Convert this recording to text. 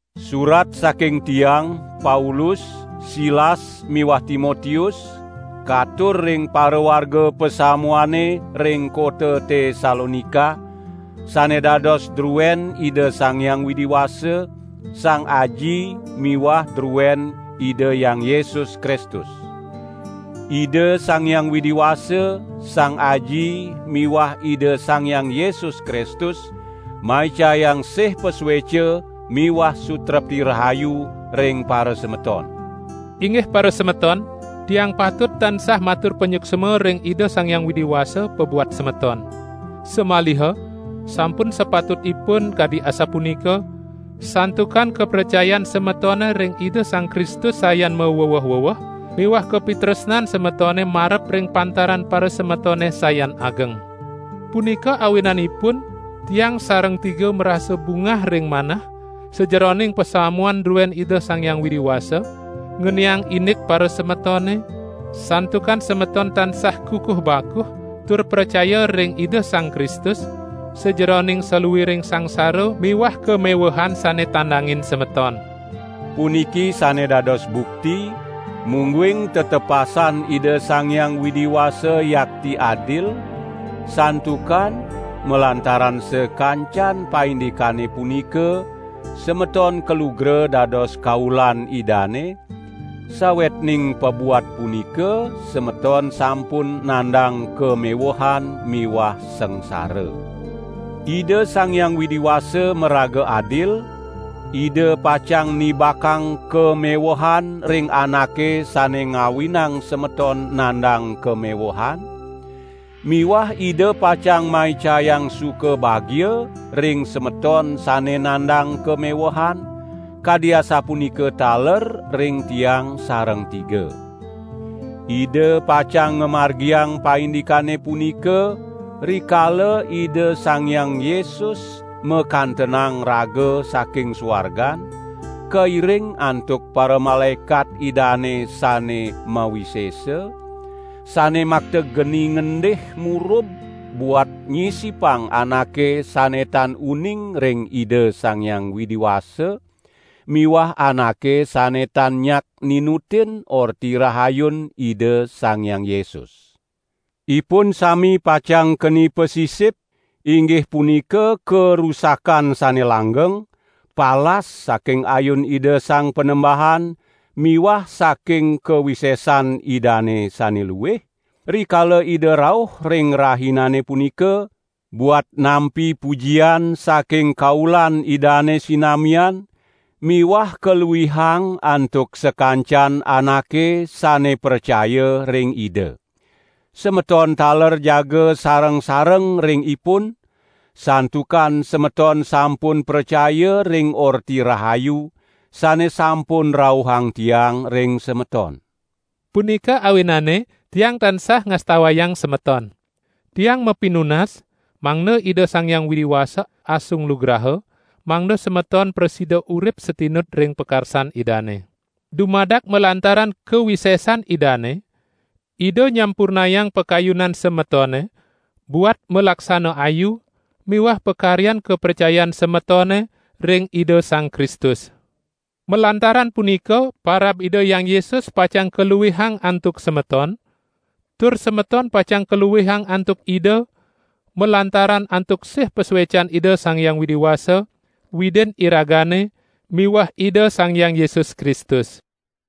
Surat saking tiang, Paulus, Silas miwah Timotius katur ring parawarga pasamuane ring kota Tesalonika, sane dados druen Ida Sang Hyang Widi Wasa, Sang Aji miwah druen Ida Hyang Yesus Kristus. Ida Sang Hyang Widi Wasa, Sang Aji miwah Ida Sang Hyang Yesus Kristus maicayang sih pasueca miwah sutrepti rahayu ring parasemeton. Inggih parasemeton, tiang patut tansah matur panyuksma ring Ida Sang Hyang Widi Wasa pabuat semeton. Samaliha sampun sapatutipun kadi asapunika, santukan kapracayan semetone ring Ida Sang Kristus sayan maweweh-weweh miwah kapitresnan semetone marep ring pantaran parasemetone sayan ageng. Punika awinanipun tiang sareng tiga marasa bungah ring manah, sajeroning pasamuan druen Ida Sang Hyang Widi Wasa, ngeniang indik parasemetone, santukan semeton tansah kukuh bakuh tur pracaya ring Ida Sang Kristus, sajeroning saluiring sangsara miwah kamewehan sane tandangin semeton. Puniki sane dados bukti, mungguing tetepasan Ida Sang Hyang Widi Wasa yakti adil, santukan malantaran sakancan paindikane punika, semeton kalugra dados kaulan Idane, sawetning pabuat punika semeton sampun nandang kamewehan miwah sangsara. Ida Sang Hyang Widi Wasa maraga adil; Ida pacang nibakang kamewehan ring anake sane ngawinang semeton nandang kamewehan, miwah Ida pacang maicayang suka bagia ring semeton sane nandang kamewehan, kadi asapunika taler ring tiang sareng tiga. Ida pacang ngamargiang paindikane punika, rikala Ida Sang Hyang Yesus makantenang raga saking suargan, kairing antuk paramalaekat Idane sane mawisesa, sane makta geni ngendih murub buat nyisipang anake sane tan uning ring Ida Sang Hyang Widi Wasa miwah anake sane tan nyak ninutin Orti Rahayun Ida Sang Hyang Yesus. Ipun sami pacang keni pasisip, inggih punika karusakan sane langgeng, palas saking ayun Ida Sang Panembahan miwah saking kawisesan Idane sane luih, rikala Ida rauh ring Rahinane punika, buat nampi pujian saking kaulan Idane sinamian miwah kaluihang antuk sakancan anake sane pracaya ring Ida. Semeton taler jaga sareng-sareng ring ipun, santukan semeton sampun pracaya ring Orti Rahayu, sane sampun rauhang tiang ring semeton. Punika awinane tiang tansah ngastawayang semeton. Tiang mapinunas, mangda Ida Sang Hyang Widi Wasa asung lugraha, mangda semeton prasida urip satinut ring pakarsan Idane. Dumadak malantaran kawisesan Idane, Ida nyampurnayang pakayunan semetone buat malaksana ayu miwah pakaryan kapracayan semetone ring Ida Sang Kristus. Malantaran punika parab Ida Hyang Yesus pacang kaluihang antuk semeton, tur semeton pacang kaluihang antuk Ida, malantaran antuk sih pasuecan Ida Sang Hyang Widi Wasa, Widin iragane miwah Ida Sang Hyang Yesus Kristus.